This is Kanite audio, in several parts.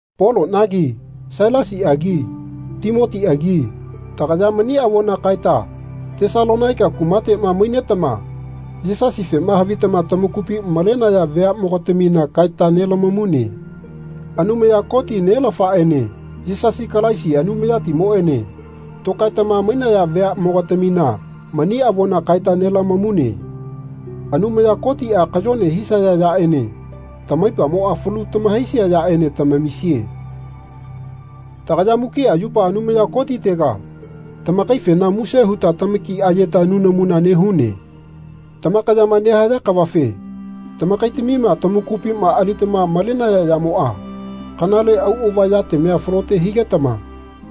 Polonagi Sailasiagi Timotiagi tagaya mani avona kaeta Tesalonaika kumatema mainetama Yisasifema havitama tamakupi malenaya veamogatamina kaeta nelamamune. Anumaya Koti, Nelafaene Yisasi Kalaisi, Anumayatimoene tokaetama mainaya veamogatamina mani avona kaeta nelamamune. Anumaya Kotia kayone hisaya yaene tamaipamoa falu tamahaisia yaene tamamisie. Tagaya mukia yupa Anumaya Kotitega tamakaifena muse huta tamaki ayeta nunamuna nehune. Tamakayama nehaya kavafe tamakaitamima tamakupima alitama malenaya yamoa kanale auava yatamia falote higetama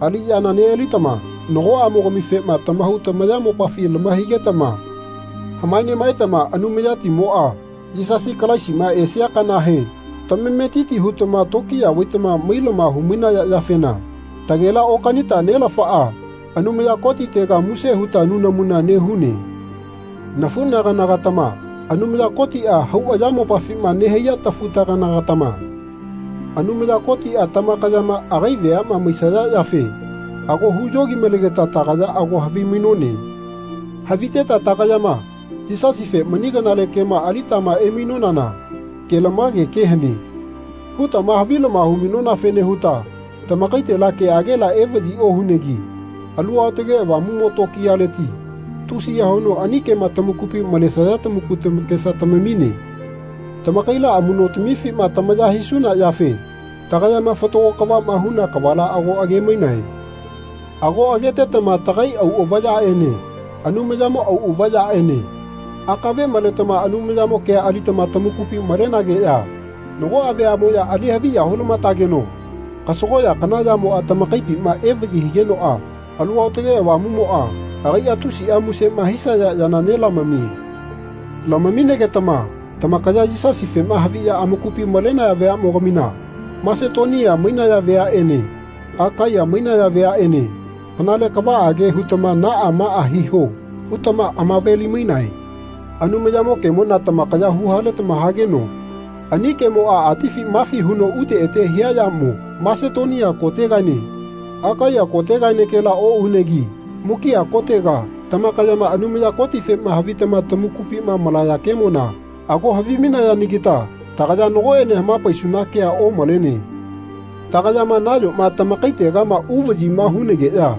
aliyana nealitama nagoamogamifema tamahau tamayamopafi lamahaigetama hama nemaetama Anumayatimoa Yisasi Kalaisima esia kanahe tamametiti hutama tokiya vaitama mailama humainaya yafena tagela-okanita Nelafaa Anumaya Kotitega muse huta nunamuna nehune. Nafunagana-gatama, Anumaya Kotia hau ayamopafima nehaiya tafutagana-gatama, Anumaya Kotia tamakayama agai veama maisaya yafe ago huyogi-malegeta tagaya ago havimainone. Haviteta tagayama Yisasife mani kanale kema alitama emainonana Kelamage kea hane. hutama havilama hu-mainonafene huta tamakaitela keagela evayi ohunegi Alu Aotage Avamumo tokiyaleti tusiya huno ani kema tamakupi malesaya tamaku tamakesa tamamine. Tamakaila amunotamifima tamaya hisuna yafe tagayama fatago kavama huna kavala ago age-mainae. Ago agetetama tagai auava yaene Anumayamo auava yaene akave maletama Anumayamo kea alitama tamakupi malenageya nagoa vayamoya alihavi ya hulamatageno kasagoya kana yamoa tamakaipima evayi higenoa Alu Aotage Avamumoa agaia tusia musema hisaya yana nelamamie. Lamamigetama tamakaya Yisasifema haviya amakupi malenaya vayamogamina Masetonia mainaya veanene Akaiya mainaya veanene kanale kavaage hutama Naa maa hiho. hutama amave-limainae. Anumayamo kemona tamakaya huhaletama hageno ani kemoa atifi mafi huno ute ete hia yamo Masetonia kotegaene Akaiya kotegaenekela ounegi mukia kotega tamakayama Anumaya Kotifema havitama tamakupima malaya kemona ago havimainayanagita tagaya nagoene hamapaisuna kea omalene. Tagayama nayoma tamakaitegama uvayima hunageya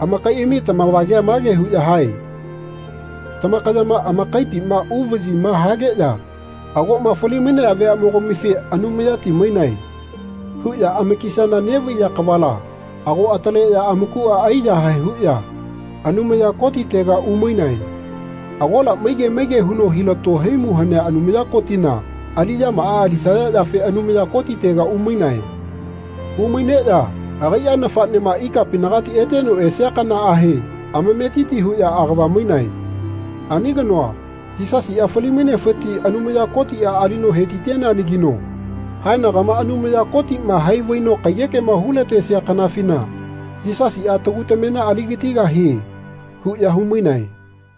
amakaiami tamavagea mage huya hae Tamakayama amakaipima uvayima hageya agoma fali-mainaya veanemogamife Anumayati mainae. huya amakisana nevaiya kavala ago ataleya amakua aiyahae huya Anumaya Kotitega umainae. Agola maige maige huno hilato haimu hanea Anumaya Kotina aliyamaa alisaya yafe Anumaya Kotitega umainae. Umaineya agaia nafanema ikapinagati eteno esia kanaahe amametiti huya agava mainae. Ani kanoa, Yisasia fali-mainefiti Anumaya Kotia alino hetiteneanagino haenagama Anumaya Kotima hai vaino kaiyekema hulatesia kanafina Yisasia tagu tamena aligatigahie. huya humainae.